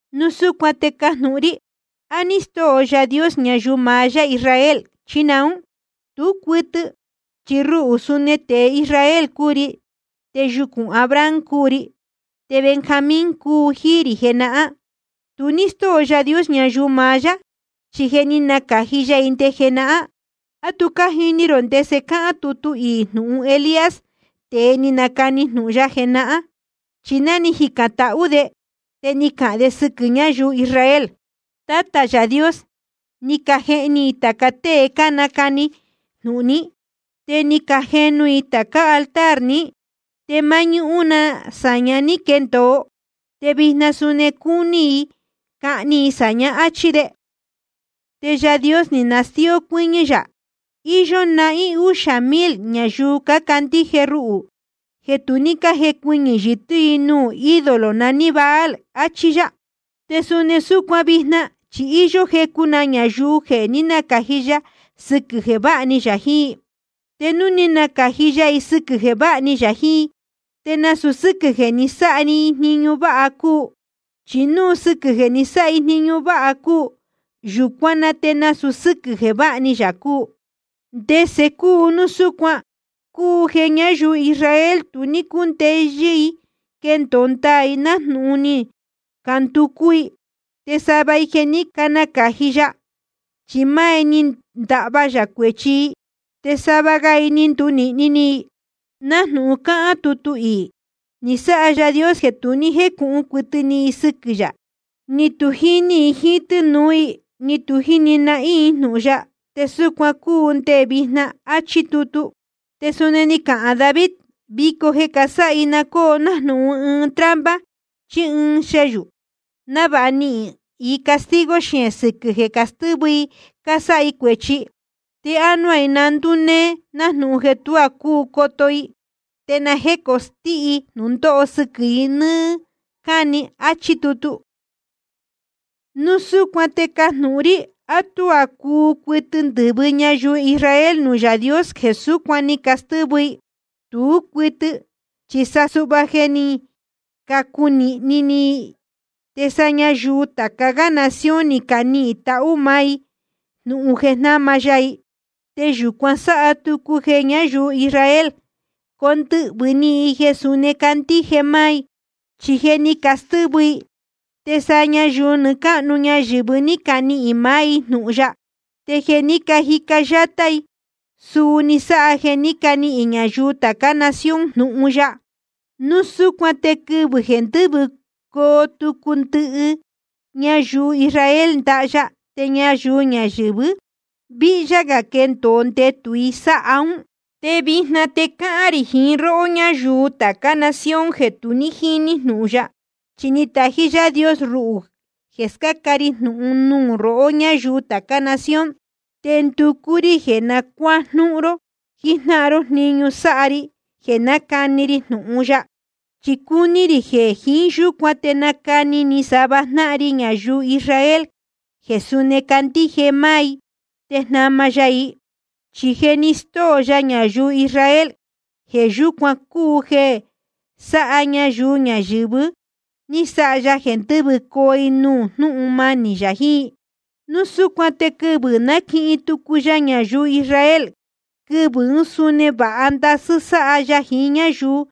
Núu súcuan te cájnūhun rí: ¿A ní stóo Yaā Dios ñayuu maá yá Israel, chí naún? Tú cuɨtɨ. Chi ruhū suni tēe Israel cúu ri, te yucūn Abraham cúu ri, te Benjamín cúu jíí rī jenahán. Tu ní stóo Yaā Dios ñayuu maá yá, chi je ni nacāji ya i nde jenahán. ¿A tu cájini rō ndese cáhán tutu iī jnūhun Elías, tēe ni nacani jnūhun ya jenahán? Chi náa jícán tahú de, te ni cahān de sɨquɨ̄ ñáyuu Israel: Tátā Yaā Dios, ni cajehni i tāca tée cánacani jnūhun ní, te ni cajenu i tācá altar ní. Te máñúhún na sāña ní quendōo, te vijna suni cácuni i cahni i sāña, áchí de. Te Yaā Dios ni nastíó cuɨ́ñɨ́ yā: Iyó nahín úxā mil ñayuu cácandíje ruhū jeē tu ní cájecuɨñɨ̄ yɨtɨ́ i nuū ídolo naní Baal, achí yá. Te suni súcuan vijna, chi íyó jecu na ñayuu jeē ní nacāji ya sɨquɨ̄ jeē váha ni yā jiín i. Te núu ni nacāji ya i sɨquɨ̄ jeē váha ni yā jiín i, te nasūu sɨ́quɨ̄ jeē ni sáha i jniñu váha cúu. Chi núu sɨquɨ̄ jeē ni sáha i jniñu váha cúu, yūcuán na te nasūu sɨ́quɨ̄ jeē váha ni yā cúu. ¿Te ndese cúu núu súcuan? Cúu jeē ñáyuu Israel tu ní cúndeyɨ́ i quendōo ndaā i nájnūhun ni canducú i. Te sava i jeē ní nacāji ya, chi máá i ni ndahva yā cuēchi i. Te sava ga i ni ndunīhni ni i, nájnūhun cáhán tutu iī: Ni sáha Yaā Dios jeē tu jécūhun cuɨtɨ ni i sɨquɨ̄ yā, ni tu jíní i jiín tɨ́nūú i, ni tu jíni nahín i jnūhun ya, te súcuan cúu nde vijna. Achí tutu. Te suni ni cahān David: Vico jeē casáha i, na cóo nájnūhun ɨɨn trampa chí ɨɨn xeyū, návāha nihīn i castigo xeēn sɨquɨ̄ jeē castɨ́vɨ i cásáha i cuēchi. Te ánuá i na ndúnee, nájnūhun jeē tuá cúu coto i, te na jécostɨ́hɨ́ jnūndóho sɨquɨ̄ i nɨ́ɨ́ cáni. Achí tutu. Núu súcuan te cájnūhun rí: ¿A tuá cúu cuɨtɨ ndɨ̄vɨ ñayuu Israel nuū Yaā Dios jeē súcuan ni castɨ́vɨ i? Tú cuɨtɨ. Chi sa suhva jeē ní cacunīhni ni i, te sa ñayuu tāca gá nación ni canihīn tahú máá i jnūhun jeē jnáma ya i. Te yūcuan sáha tucu jeē ñáyuu Israel condɨhvɨ̄ ni i jeē suni candíje máá i. Chi jeē ní castɨ́vɨ i, te sa ñayuu nɨɨ́ cáhnu ñayɨ̄vɨ ní canihīn maá i jnūhun ya. Te jeē ní cajica yátá i, suu ni sáha jeē ní canihīn ñayuu tācá nación jnūhun ya. Núu súcuan te quɨvɨ̄ jeē ndɨ́vɨcoo tucu ndɨhɨ ñayuu Israel ndaha ya, te ñayuu ñayɨ̄vɨ víhyá gā quendōo ndetū i sáha ún. Te vijna te cáhán rī jiín róhó ñáyuu tācá nación jeē tu ní jíní jnūhun ya. Chi ni tají Yaā Dios ruhū jeē scáca ri jnūhun nuū rohó ñáyuu tācá nación. Te ndúcú rí jeē na cuájnúhún ró jijnáhan ró jniñu sáha ri jeē nácani ri jnūhun ya. Chi cúní rī jeē jiín yúcuan te nacani ni sava jnáhan ri ñayuu Israel jeē suni candíje máá i, te jnama ya i. Chi jeē ni stóo ya ñayuu Israel, jeē yúcuan cúu jeē sa ñayuu ñayɨ̄vɨ ní sáha ya jeē ndɨ́vɨcoo i nuū jnúhun manī yā jiín i. Núu súcuan te quɨvɨ̄ naquihin tucu ya ñayuu Israel, quɨvɨ̄ ún suni vāha ndasɨ́ sáha ya jiín ñáyuu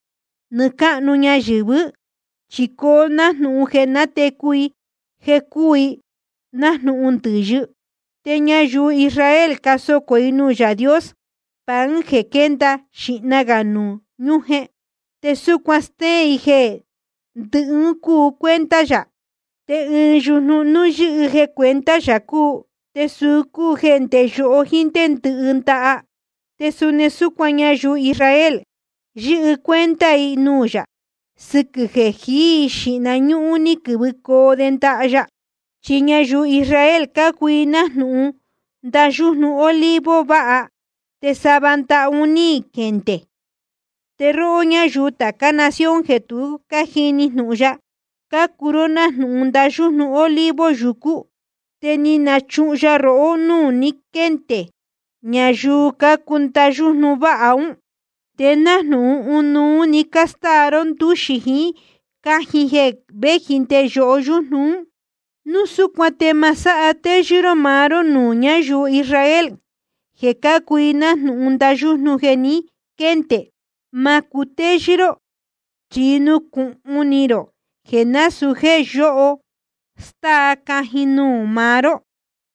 nɨɨ́ cáhnu ñayɨ̄vɨ́. Chi coo nájnūhun jeē natecu i jeē cúu i nájnūhun ndɨ̄yɨ. Te ñayuu Israel cásocō i nuū Yaā Dios pan jeē quénda xīhna gā nuū ñujen, te súcuan stéén i jeē ndɨhɨ un cúu cuenta yā. Te ɨɨn yujnu, núu yɨ́hɨ jeē cuenta yā cúu, te suu cúu nde yoho jíín ndé ndɨhɨ ndaha. Te suni súcuan ñayuu Israel, yɨ́hɨ cuenta i nuū yā, sɨquɨ̄ jeē jií i xīhna ñúhún, ni quɨ̄vɨcoo de ndaha ya. Chi ñayuu Israel cácuu i nájnūhun ndayújnu olivo váha, te sava ndaha un ní quendē. Te róhó ñáyuu tācá nación jeē tu jíní jnūhun ya, cácuu ró nájnūhun ndayújnu olivo yucú, te ni nachuhun ya rohó núū ni quéndē ñayuu cácuu ndayújnu váha ún. Te nájnūhun ɨnuú‑ni cástáa ró ndúxi jíín cajin jeē véji nde yoho yújnu ún. Núu súcuan te ma sáha téyɨ́ ró maá ró nuū ñáyuu Israel jeē cácuu nájnūhun ndayújnu jeē ni quéndē. Ma cutéyɨ́ ró, chi nucūhun ni rō jeē násūú jéē yoho stáa cajin nuū maá ró,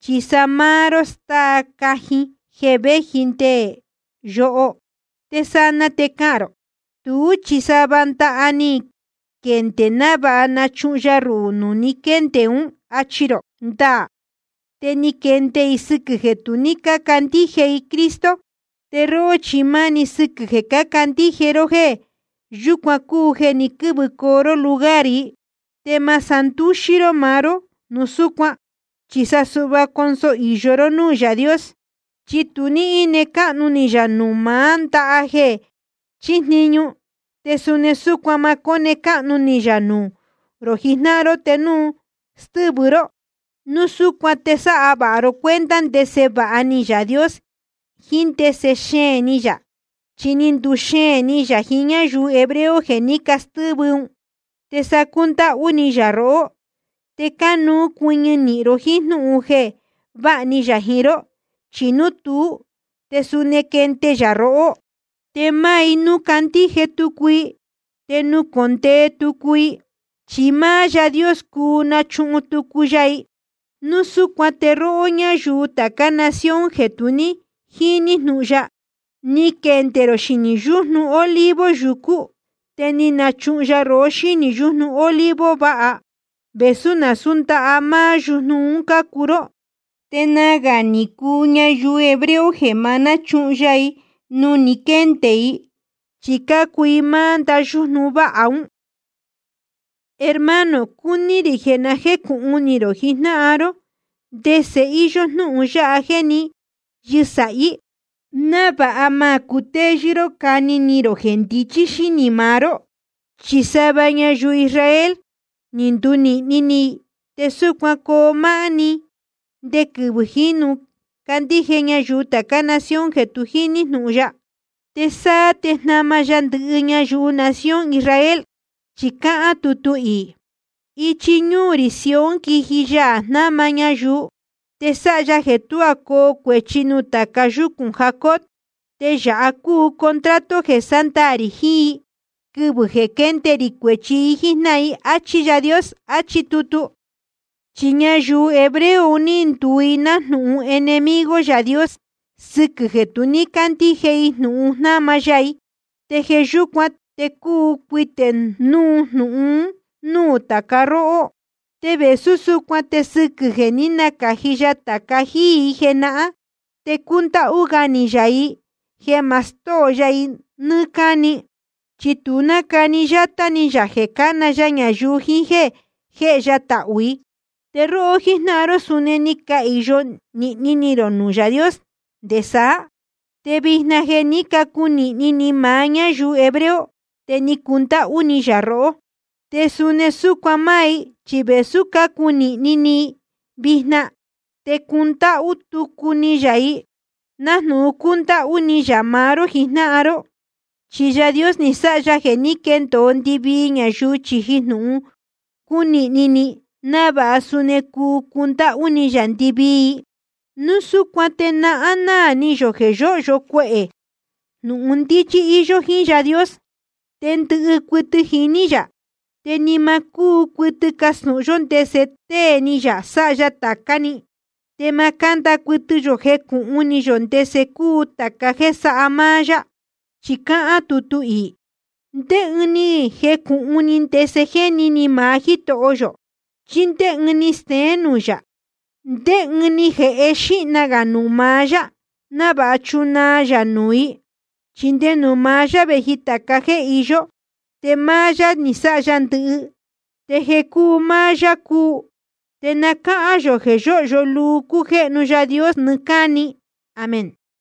chi sa máá ró stáa cajin jeē véji nde yoho. Te sanaa te cahān rō: Tú chi sava ndaha ni quendē návāha nachuhun ya ruhū nuū ni quéndē ún, achi rō. Ndaā, te ni quendē i sɨquɨ̄ jeē tu ní cácandíje i Cristo. Te róhó chi máni sɨquɨ̄ jeē cácandíje ró, jeē yúcuan cúu jeē ni quɨ́vɨcoo ró lugar i. Te ma sándúxí ró maá ró núu súcuan, chi sa suhva conso īyo ró núū Yaā Dios. Chi tu ní íne cáhnu ni yā nuū maá ndaha jeē chíjniñu, te suni súcuan ma cóne cáhnu ni yā nuū rō jijnáhan ró te núu stɨ́vɨ ró. Núu súcuan te sáha vāha ro cuenta ndese vāha ni Yaā Dios jiín ndese xeēn ni yā. Chi ni nduxeēn ni yā jiín ñáyuu hebreo jeē ní castɨ́vɨ ún, te sa cúndáhú ni yā rohó. Te cánuú cuɨñɨ nīhin ro jíín jnúhun jeē váha ni yā jiín ró. Chi núu tuú, te suni quende yā rohó. Te máá i, núu candíje tucu i, te nucōndee tucu i, chi máá Yaā Dios cuu nachuhun tucu ya i. Núu súcuan te róhó ñáyuu tācá nación jeē tu ní jíní jnūhun ya, ni quendē rō xinī yújnu olivo yucú, te ni nachuhun ya rohó xínī yujnu olivo váha, vēsú nasūú ndaha máá yujnu un cácuu ró. Te nagā ni cuu ñayuu hebreo jeē ma náchuhun ya i nuū ni quéndē i, chi cácuu i máá ndayújnu váha ún. Hermano, cúní rī jeē na jécūhun ni rō jijnáhan ró ndese íyó jnúhun yáha jéē ní yɨsāhí, návāha ma cutéyɨ́ ró cani ni rō jeē ndichí xínī maá ró: Chi sava ñayuu Israel ni ndunīhni ni i, te súcuan coo máá‑ni nde quɨvɨ̄ jínu candíje ñayuu tācá nación jeē tu jíní jnūhun ya. Te sáá te jnama ya ndɨhɨ ñayuu nación Israel, chi cáhán tutu iī: Ichi ñuu rī Sión quiji Yaā jnáma ñayuu, te sáha ya jeē tuá coo cuēchi nuū tāca yúcūn Jacob. Te yāha cúu contrato jeē sándaā rī jiín i, quɨvɨ̄ jeē quénde ri cuēchi i jíjnáhan i, áchí Yaā Dios. Achí tutu. Chi ñayuu hebreo un ní nduu i nájnūhun enemigo Yaā Dios sɨquɨ̄ jeē tu ní cácandíje i jnūhun jnáma ya i. Te jeē yúcuan te cuu cuitē núu jnūhun un núū tāca róhó. Te vēsú súcuan te sɨquɨ̄ jeē ní nacāji ya tāca jíí i jenahán, te cúndáhú gá ni yā i jeē ma stóo ya i nɨ́ɨ́ cáni. Chi tu nácani yátá ni yā jeē cána ya ñayuu jiín jéē jéhe ya tahū i. Te róhó jíjnáhan ró, suni ni cahīyo nīhni ni rō nuū Yaā Dios nde saá. Te vijna jeē ní cacunīhni ni maá ñáyuu hebreo, te cúndáhú ni yā rohó. Te suni súcuan máá i, chi vēsú cácunīhni ni i vijna, te cundáhú tucu ni yā i, nájnūhun cúndáhú ni yā maá ró jijnáhan ró. Chi Yaā Dios ni sáha ya jeē ní quendōo ndɨvii ñayuu chīji jnúhun cúnīhni ni i, návāha suni cuu cundáhú ni yā ndɨvii i. Núu súcuan te náhán náā ni yō jeē yóhyo cuehē jnūhun ndíchí íyó jíín Yaā Dios, te ndɨhɨ cuɨtɨ jiní yā. Te ni ma cúu cuɨtɨ castūhun yó ndese tée ni yā sáha ya tācá‑ni, te ma cánda cuɨtɨ yō jecūhun ni yō ndese cúu tāca jéē sáha máá yá. Chi cáhán tutu iī: ¿Ndé ɨɨn ni jecūhun ni ndese jéni ni maá Jítoho yō? ¿Chí ndé ɨɨn ni steén nuū yā? ¿Ndé ɨɨn ni jēhe xīhna gā nuū maá yá, návāha nachunaa yā nuū i? Chi nde nuū maá yá vēji tāca jéē iyó, te máá yá ni sáha ndɨhɨ, te jeē cúu máá yá cúu. Te na cáhán yō jeē yóhyo luu cújéhnu Yaā Dios nɨɨ́ cáni. Amén.